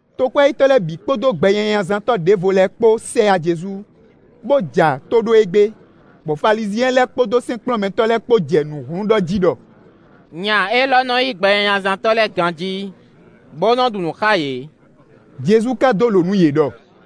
Tokwɛ́yítɔ́ lɛ́ɛ bǐ kpódó gbɛnyanyazántɔ́ ɖěvo lɛ́ɛ kpó sɛ yá Jezu, bó ja tó ɖó e gbé, bɔ Falizyɛn lɛ́ɛ kpódó sɛ́nkplɔ́nmɛtɔ́ lɛ́ɛ kpó jɛ nǔ hlún ɖɔ jí ɖɔ: “Nya élɔ́ nɔ́ yí gbɛnyanyazántɔ́ lɛ́ɛ ganjí, bó nɔ ɖu nǔ xá yě.” Jezu ka dó lǒ nú yě ɖɔ: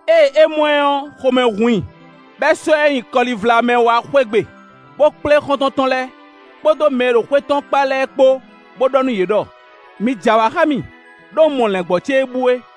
Ée é mɔ ɛ ɔ́, xomɛ hun i, bɔ é sɔ́ ɛ nyi kɔlivla mɛ wá xwé gbe, bó kplé xɔ́ntɔn tɔn lɛ́ɛ, kpódó mɛ e ɖo xwé tɔn kpá lɛ́ɛ kpó, bó ɖɔ nú yě ɖɔ: ‘Mi j'awǎ xá mì, ɖó un mɔ lɛ̌ngbɔ́ ce e bú é.’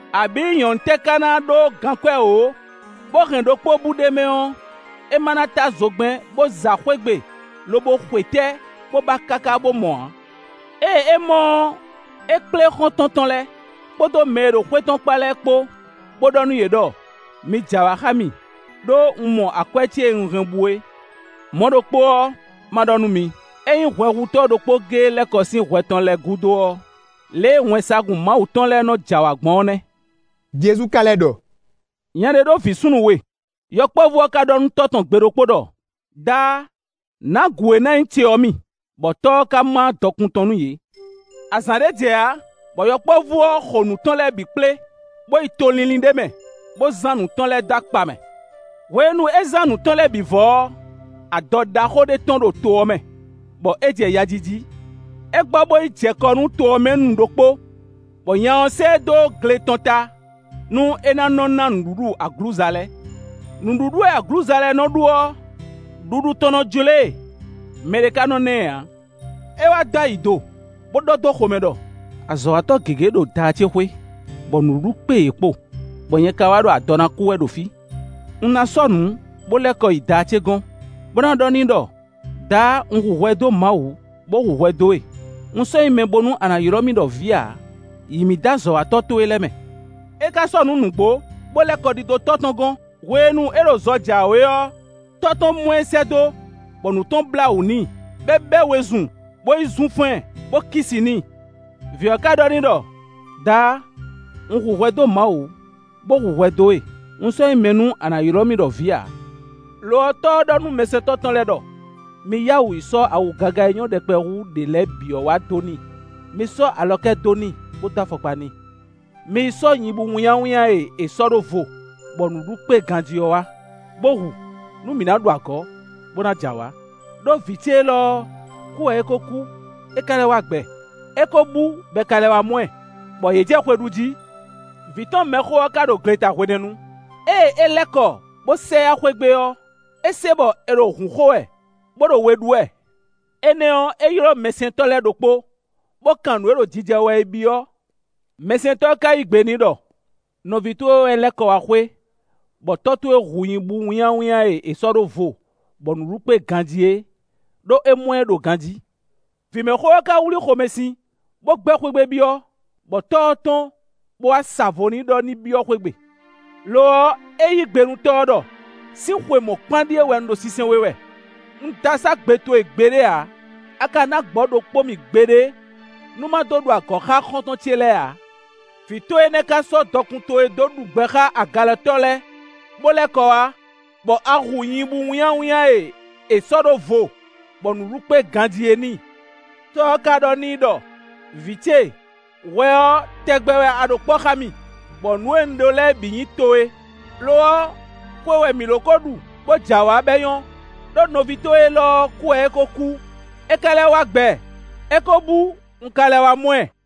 “Abǐ nyɔ̌nu tɛ́ ká ná ɖó gankwɛ́ wǒ, bó hɛn ɖokpó bú ɖ'é mɛ ɔ́, é má ná tá zogbɛ́n, bó za xwé gbe, lobo xwetɛ́, bó ba káká bó mɔ ǎ? Ée é mɔ ɔ́, é kplé xɔ́ntɔn tɔn lɛ́ɛ, kpódó mɛ e ɖo xwé tɔn kpá lɛ́ɛ kpó, bó ɖɔ nú yě ɖɔ: ‘Mi j'awǎ xá mì, ɖó un mɔ akwɛ́ ce e un hɛn bú é.’ Mɔ̌ ɖokpó ɔ́, má ɖɔ nú mi: ényí hwɛhutɔ́ ɖokpó géé lɛ́ kɔ sín hwɛ tɔn lɛ́ɛ gúdo ɔ́, lě e wɛnsagun Mawu tɔn lɛ́ɛ nɔ j'awǎ gbɔn ɔ́ nɛ́.” Jezu ka lɛ́ ɖɔ: “Nya ɖé ɖó vǐ súnnu we. Yɔkpɔ́vú ɔ́ ka ɖɔ nú tɔ́ tɔn gbe ɖokpó ɖɔ: ‘Daá, nǎ gǔ e ná nyí ce ɔ́ mì;’ bɔ tɔ́ ɔ́ ka má dɔkun tɔn nú yě. Azǎn ɖé jɛ ǎ, bɔ yɔkpɔ́vú ɔ́ xo nǔ tɔn lɛ́ɛ bǐ kplé, bó yi to línlín ɖé mɛ, bó zán nǔ tɔn lɛ́ɛ dó akpa mɛ. Hwenu e é zán nǔ tɔn lɛ́ɛ bǐ vɔ ɔ́, adɔ ɖaxó ɖé tɔ́n ɖo to ɔ́ mɛ, bɔ é jɛ ya ji jí. É gbɔ bó yi jɛ kɔ nú to ɔ́ mɛ nu ɖokpó, bɔ nya ɔ́ sɛ́ ɛ dó gle tɔn ta, nú é ná nɔ́ ná nǔɖuɖu aglǔza lɛ́ɛ. Nǔɖuɖu e aglǔza lɛ́ɛ nɔ ɖu ɔ́, ɖuɖu tɔn nɔ jló e, mɛɖé ka nɔ ná ɛ ǎ. É wá dó ayi do, bó ɖɔ dó xomɛ ɖɔ: ‘Azɔ̌watɔ́ gěgé wɛ ɖo daá ce xwé, bɔ nǔɖuɖu kpé yě kpo, bɔ nyɛ ka wá ɖo adɔ ná kú wɛ ɖo fí. Un ná sɔ́ nǔ, bó lɛ́ kɔ yi daá ce gɔ́n, bó na ɖɔ n'i ɖɔ: Daá! Un hu hwɛ dó Mawu, bó hu hwɛ dó we; un sɔ́ nyí mɛ bónú a na ylɔ́ mì ɖɔ vǐ ǎ; yǐ mì dó azɔ̌watɔ́ towe lɛ́ɛ mɛ.’ É ka sɔ́ nǔ nǔgbó, bó lɛ́ kɔ ɖidó tɔ́ tɔn gɔ́n. “Hwenu e é ɖo zɔ jǎwe ɔ́, tɔ́ tɔn mɔ ɛ sɛ́ dó, bɔ nǔ tɔn blá wǔ n'i, bɔ é bɛ́ wezun, bó yi zunfán ɛ, bó kí si n'i. Vǐ ɔ́ ka ɖɔ n'i ɖɔ: ‘Daá, un hu hwɛ dó Mawu, bó hu hwɛ dó we; un sɔ́ nyí mɛ nú a nǎ ylɔ́ mì ɖɔ vǐ ǎ.’ Lo ɔ́, tɔ́ ɔ́ ɖɔ nú mɛsɛntɔ́ tɔn lɛ́ɛ ɖɔ: ‘Mi yá wǔ yi sɔ́ awu gaga e nyɔ́ ɖɛkpɛ hú ɖě lɛ́ɛ bǐ ɔ́ wá dó n'i; mi sɔ́ alɔkɛ́ dó n'i, bó dó afɔkpa n'i. Mi yi sɔ́ nyibú wínnyáwínnyá e è sɔ́ ɖó vo, bɔ nǔɖuɖu kpé e ganjí ɔ́ wá, bó hu, nú mǐ ná ɖu agɔ̌, bó ná j'awǎ; ɖó vǐ ce élɔ́ ɔ́, kú wɛ é ko kú; é ka lɛ́ wá gbɛ. É ko bú bɔ è ka lɛ́ wá mɔ ɛ;’ bɔ yě jɛ xwe ɖu jí. “Vǐ tɔn mɛxó ɔ́ ka ɖo gleta hwenɛ́nu. Ée é lɛ́ kɔ bó sɛ yá xwé gbe ɔ́, é se bɔ è ɖo hǔn xo wɛ, bó ɖo we ɖú wɛ. Énɛ́ ɔ́, é ylɔ́ mɛsɛntɔ́ lɛ́ɛ ɖokpó, bó kan nǔ e ɖo jijɛ wɛ é byɔ́. Mɛsɛntɔ́ ɔ́ ka yí gbe n'i ɖɔ: ‘Nɔví towe wɛ lɛ́ kɔ wá xwé, bɔ tɔ́ towe hu nyibú wínnyáwínnyá e è sɔ́ ɖó vo, bɔ nǔɖuɖu kpé ganjí é, ɖó é mɔ ɛ ɖo ganjí.’ Vǐmɛxó ɔ́ ka wlí xomɛsin, bó gbɛ́ xwé gbe byɔ́, bɔ tɔ́ ɔ́ tɔ́n, bó wá sa vo n'i ɖɔ ní byɔ́ xwé gbe. Lo ɔ́, é yí gbe nú tɔ́ ɔ́ ɖɔ: ‘Sín xwe mɔ̌kpán ɖíe wɛ un ɖo sinsɛn we wɛ; un dó asá gbe towe gbeɖé ǎ; a ka ná gbɔ̌ ɖokpó mì gbeɖé nú ma dó ɖu agɔ̌ xá xɔ́ntɔn ce lɛ́ɛ ǎ. Vǐ towe énɛ́ ka yi sɔ́ dɔkun towe dó ɖu gbɛ xá agalɛtɔ́ lɛ́ɛ, bó lɛ́ kɔ wá, bɔ a hu nyibú wínnyáwínnyá e è sɔ́ ɖó vo, bɔ nǔɖuɖu kpé ganjí é n'i.’ Tɔ́ ɔ́ ka ɖɔ n'i ɖɔ: ‘Vǐ ce, hwɛ ɔ́, tɛgbɛ wɛ a ɖo kpɔ́ xá mì, bɔ nǔ e un ɖó lɛ́ɛ bǐ nyí towe, lo ɔ́, xwe wɛ mǐ ló kó ɖu, bó j'awǎ, bɔ é nyɔ́; ɖó nɔví towe élɔ́ ɔ́, kú wɛ é ko kú; é ka lɛ́ wá gbɛ; é ko bú, un ka lɛ́ wá mɔ ɛ.’”